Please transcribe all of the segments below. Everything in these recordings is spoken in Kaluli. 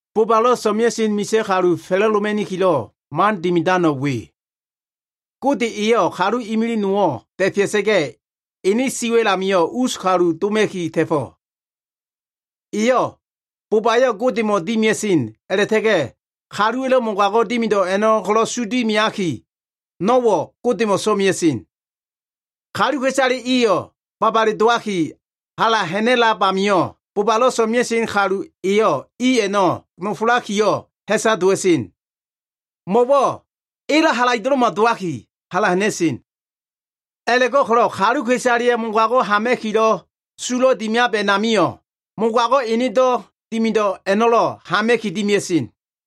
Bobalo꞉ so꞉mea꞉sen misa꞉ kalu fa꞉la꞉doma꞉nikilo꞉ man dimidano꞉ we. Gode eyo꞉ kalu imilig nowo꞉ da꞉fea꞉sa꞉ga꞉, ene siwa꞉l amio꞉ us kalu doma꞉ki ta꞉fo꞉. Eyo꞉ bobayo꞉ Godemo꞉ dimia꞉sen a꞉la꞉ta꞉ga꞉ kaluwa꞉lo꞉ mogago꞉ dimido꞉ a꞉no꞉ ko꞉lo꞉ su dimiaki, no꞉wo꞉ Godemo꞉ so꞉mea꞉sen. Kaluka꞉isale iyo꞉ babale dowaki, hala ha꞉na꞉lab amio꞉, bobalo꞉ so꞉mea꞉sen kalu eyo꞉ i a꞉no꞉ nofolakiyo꞉ ha꞉sa dowa꞉sen. Mo꞉wo꞉ elo꞉ halaido꞉lo꞉ma dowaki, hala ha꞉na꞉sen. A꞉la꞉go꞉ko꞉lo꞉ kaluka꞉isaleya꞉ mogago꞉ hama꞉kilo꞉ sulo꞉ dimiab a꞉namio꞉, mogago꞉ enedo꞉ dimido꞉ a꞉no꞉lo꞉ hama꞉ki dimia꞉sen.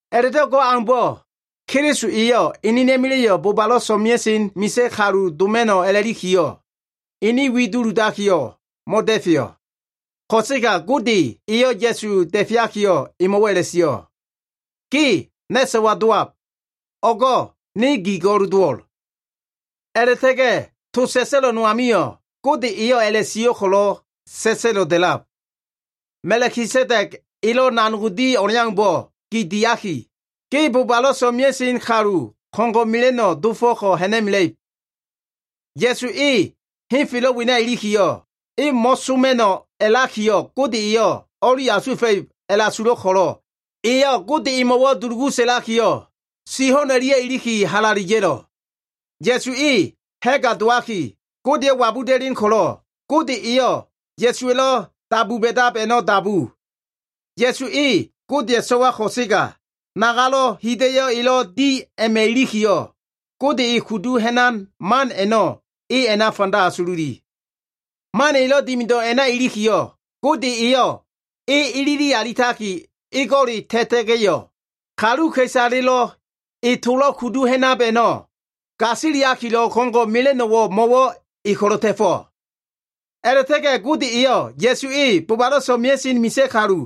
A꞉la꞉do꞉ go꞉ aumbo꞉, Keliso eyo꞉ enena꞉ma꞉la꞉yo꞉ bobalo꞉ so꞉mea꞉sen misa꞉ kalu doma꞉no꞉ a꞉lakiyo꞉, ene wi duludakiyo꞉ mo꞉da꞉feyo꞉. Ko꞉sega Gode eyo꞉ Ya꞉su da꞉feakiyo꞉, emo꞉wo꞉ a꞉la꞉sio꞉, “Ge na꞉ so꞉wa dowab. O꞉go꞉ ne gi go꞉l dowo꞉l.” A꞉la꞉ta꞉ga꞉ to sa꞉sa꞉lo꞉ no amio꞉ Gode eyo꞉ a꞉la꞉sio꞉ ko꞉lo꞉ sa꞉sa꞉lo꞉ da꞉lab. “Ma꞉kisedeg elo꞉ nanog di o꞉leaumbo꞉ gi diaki, Ge bobalo꞉ so꞉mea꞉sen kalu ko꞉ngo꞉ mela꞉no꞉ dofo꞉ ha꞉na꞉mela꞉ib.” Ya꞉su e henfelo꞉ wena ilikiyo꞉, e mo꞉soma꞉no꞉ a꞉lakiyo꞉ Gode eyo꞉ o꞉li asuwa꞉fa꞉ib a꞉la꞉asulo꞉ ko꞉lo꞉, eyo꞉ Gode emo꞉wo꞉ dulugu sa꞉lakiyo꞉, si ho꞉n o꞉lia꞉ iliki halale ya꞉lo꞉. Ya꞉su e ha꞉ga dowaki, Godeyo꞉ wabuda꞉len ko꞉lo꞉, Gode eyo꞉ Ya꞉suwa꞉lo꞉ dabu ba꞉dab a꞉no꞉ dabu. Ya꞉su e Godeya꞉ so꞉wa ko꞉sega, nagalo꞉ hida꞉yo꞉ elo꞉ di a꞉ma꞉ ilikiyo꞉, Gode kudu ha꞉nan man a꞉no꞉ e a꞉na fanda asululi. Man elo꞉ dimido꞉ a꞉na ilikiyo꞉, Gode eyo꞉ e ilili alitaki ego꞉le ta꞉ta꞉ga꞉yo꞉, kaluka꞉isale e tolo꞉ kudu ha꞉nab a꞉no꞉ gasiliakilo꞉ ko꞉ngo꞉ mela꞉no꞉wo꞉ mo꞉wo꞉ e ko꞉lo꞉ ta꞉fo꞉. A꞉la꞉ta꞉ga꞉ Gode eyo꞉ Ya꞉su e bobalo꞉ so꞉mea꞉sen misa꞉ kalu,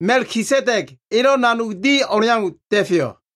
Ma꞉kisedeg elo꞉ nanog di o꞉leau da꞉feyo꞉.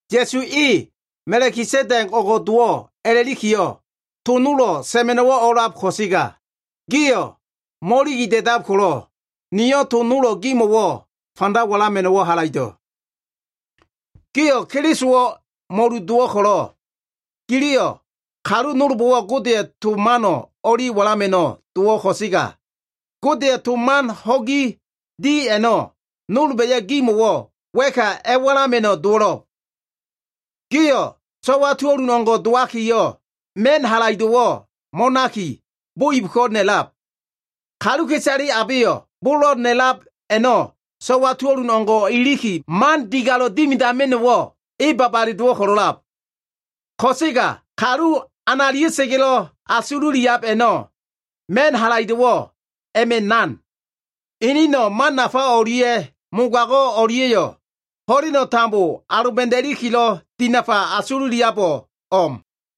Ya꞉su e Ma꞉kisedeg o꞉ngo꞉ dowo꞉ a꞉la꞉likiyo꞉, to nolo꞉ sa꞉ma꞉no꞉wo꞉ o꞉a꞉lab ko꞉sega, gio꞉ mo꞉iligi da꞉da꞉lab ko꞉lo꞉, niyo꞉ to nolo꞉ gimo꞉wo꞉ fanda walama꞉no꞉wo꞉ halaido꞉. Gio꞉ Kelisowo꞉ mo꞉lu dowo꞉ ko꞉lo꞉, giliyo꞉ kalu nolbo꞉wo꞉ Godeya꞉ to mano꞉ o꞉li walama꞉no꞉ dowo꞉ ko꞉sega, Godeya꞉ to man ho꞉gi di a꞉no꞉ nolba꞉yo꞉ gimo꞉wo꞉ wa꞉ka a꞉walama꞉no꞉ dowo꞉lo꞉b. Gio꞉ so꞉wa tuo꞉lun o꞉ngo꞉ dowakiyo꞉, ma꞉n halaido꞉wo꞉ mo꞉naki, bo ibko꞉ na꞉lab. Kaluka꞉isale abeyo꞉ bolo꞉ na꞉lab a꞉no꞉ so꞉wa tuo꞉lun o꞉ngo꞉ o꞉iliki, man digalo꞉ dimidama꞉no꞉wo꞉ e babale dowo꞉ ko꞉lo꞉lab. Ko꞉sega kalu analia꞉sa꞉ga꞉lo꞉ asululiab a꞉no꞉, ma꞉n halaido꞉wo꞉ a꞉ma꞉ nan. Inino꞉ man nafa o꞉lia꞉ mogago꞉ o꞉lia꞉yo꞉ ho꞉leno꞉ tambo aloba꞉da꞉likilo꞉ dinafa asululiabo꞉ o꞉m.